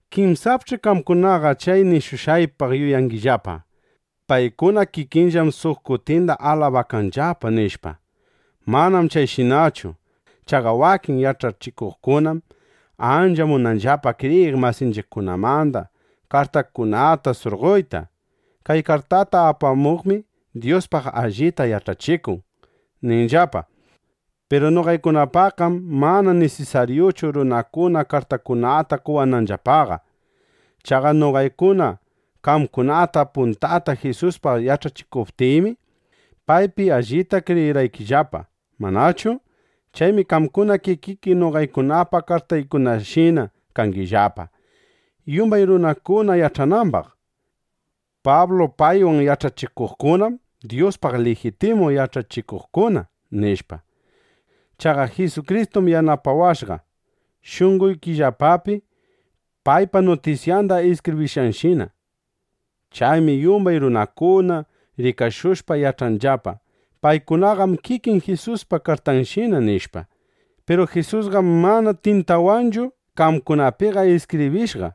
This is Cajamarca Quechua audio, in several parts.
Kinsapch'i qamkunaqa chay nishushqaypaq yuyangillapa: Paykuna kikinllam suq kutinda alabakanllapa, nishpa. Manam chayshinachu. Chaqa wakin yach'achikuqkunam ancha munanllapa kriyiq masinchiqkunamanda kartakunata surqoyta: “Kay kartata apamuqmi Dyuspaq allita yach'achikun”, ninanllapa. Piru noqaykunapaqqam mana nisisaryuchu runakuna kartakunata qowananllapaqa. Chaqa noqaykuna qamkunata puntata Jisuspaq yach'achishuptiymi, paypi allipta kriyirqaykillapa, ¿manachu? Chaymi qamkuna kikiki noqaykunapa kartaykunashina kangillapa, yumbay runakuna yach'anambaq: Pablu paywan yach'achikuqkunam Dyuspaq lijitimu yach'achikuqkuna, nishpa. Chaqa Jisukristum yanapawashqa, shunqoykillapapi paypa nutisyanda iskibrinayshina. Chaymi yumbay runakuna rikashushpa yach'anllapa: Paykunaqam kikin Jisuspa kartanshina, nishpa. Piru Jisusqam mana tintawanchu qamkunapiqa iskibrishqa,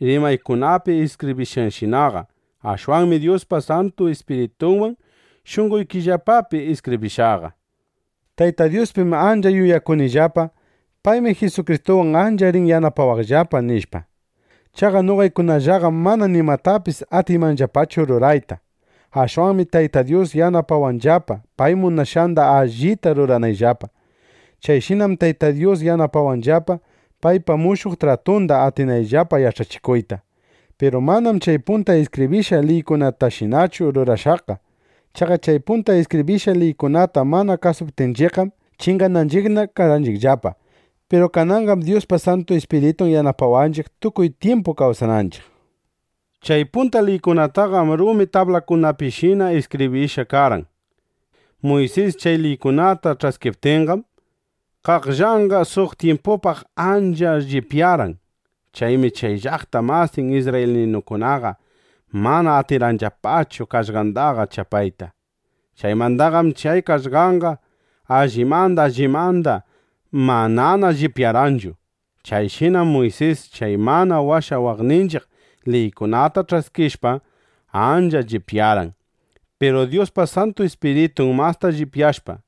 rumikunapi iskibrishqanshinaqa. Ashwanmi Dyuspa Santu Ispiritunwan shunqoykillapapi iskibrishqaqa. Tayta Dyuspim ancha yuyakunillapa: Paymi Jisukristuwan ancha rin yanapawaqllapa, nishpa. Chaqa noqaykunallaqam mana nimatapis atiymanllapachu rurayta. Ashwanmi Tayta Dyus yanapawanllapa, pay munashqanda allita ruranayllapa. Chayshinam Tayta Dyus yanapawanllapa, paypa mushuq tratunda atinayllapa yach'achikuyta. Piru manam chay punta iskibrishqa liykunatashinachu rurashqaqa. Chaqa chay punta iskibrishqa liykunata mana kasuptinchiqqam, chingananchiqna karqanchiqllapa. Piru kananqam Dyuspa Santu Ispiritun yanapawanchiq, tukuy tyimpu kawsananchiq. Chay punta liykunataqam rumi tablakunapishina iskibrishqa karqan. Muysis chay liykunata ch'askiptinqam, qaqllanqa suq tyimpupaq ancha llipyarqan. Chaymi chay llaqta masin isrraylinukunaqa mana atirqanllapachu qaqllandaqa chapayta. Chaymandaqam chay qaqllanqa allimanda allimanda manana llipyarqanchu. Chayshinam Muysis chay mana washawaqninchiq liykunata ch'askishpa, ancha llipyarqan. Piru Dyuspa Santu Ispiritun masta llipyashpa,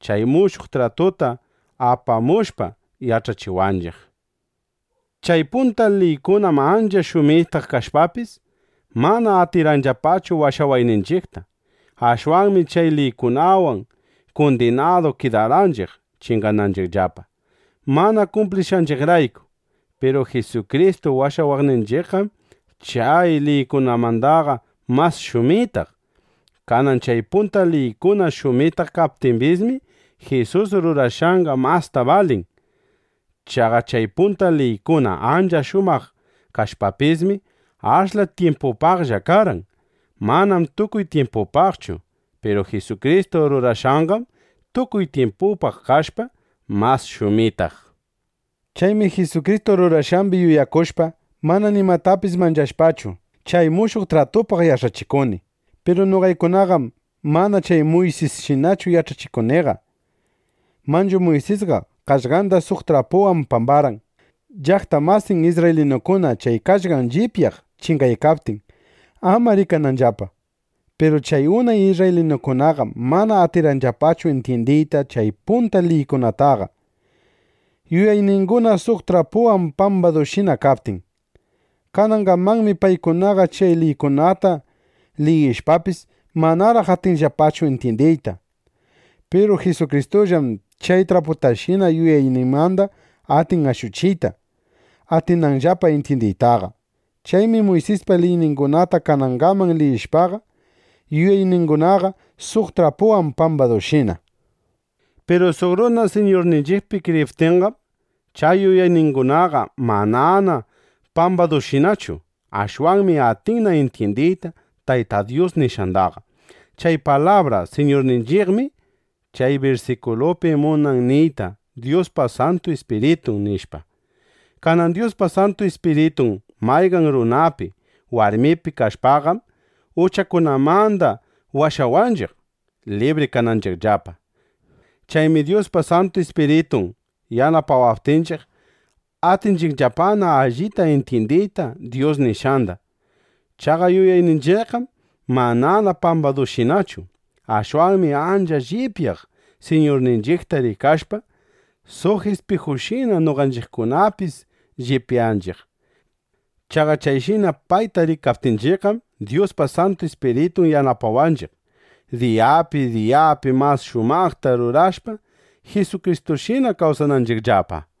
chay mushuq tratuta apamushpa, yach'achiwanchiq. Chay punta liykunam ancha shumitaq kashpapis, mana atirqanllapachu washawayninchiqta. Ashwanmi chay liykunawan kundinadu kidarqanchiq chingananchiqllapa, mana kumplishqanchiqrayku. Piru Jisukristu washawashqanchiqqam chay liykunamandaqa mas shumitaq. Kanan chay punta liykuna shumitaq kaptimbismi, Jisus rurashqanqa masta balin. Chaqa chay punta liykuna ancha shumaq kashpapismi, ashla tyimpupaqlla karqan. Manam tukuy tyimpupaqchu. Piru Jisukristu rurashqanqam tukuy tyimpupaq kashpa, mas shumitaq. Chaymi Jisukristu rurashqambi yuyakushpa, mana nimatapis manchashpachu, chay mushuq tratupaq yach'achikuni. Piru noqaykunaqam mana chay Muysisshinachu yach'achikuniqa. Manchu Muysisqa qaqllanda suq trapuwan pambarqan, llaqta masin isrraylinukuna chay qaqllan llipyaq chingaykaptin, ama rikananllapa. Piru chay unay isrraylinukunaqam mana atirqanllapachu intyindiyta chay punta liykunataqa, yuyayninguna suq trapuwan pambadushina kaptin. Kanangamanmi paykunaqa chay liykunata liyishpapis, manaraq atinllapachu intyindiyta. Piru Jisukristullam chay traputashina yuyayninmanda atin ashuchiyta, atinanllapa intyindiytaqa. Chaymi Muysispa liyningunata kanangaman liyishpaqa, yuyayningunaqa suq trapuwan pambadushina. Piru suq runa Siñurninchiqpi kriyiptinqam, chay yuyayningunaqa manana pambadushinachu. Ashwanmi atinna intyindiyta Tayta Dyus nishqandaqa. Chay palabra “Siñurninchiqmi” chay birsikulupi munan niyta Dyuspa Santu Ispiritun, nishpa. Kanan Dyuspa Santu Ispiritun mayqan runapi, warmipi kashpaqam, uchakunamanda washawanchiq, libri kananchiqllapa. Chaymi Dyuspa Santu Ispiritun yanapawaptinchiq, atinchiqllapana allita intyindiyta Dyus nishqanda. Chaqa yuyayninchiqqam manana pambadushinachu. Ashwanmi ancha llipyaq Siñurninchiqta rikashpa, suq ispijushina noqanchiqkunapis llipyanchiq. Chaqa chayshina payta rikaptinchiqqam, Dyuspa Santu Ispiritun yanapawanchiq, diyapi diyapi mas shumaqta rurashpa Jisukristushina kawsananchiqllapa.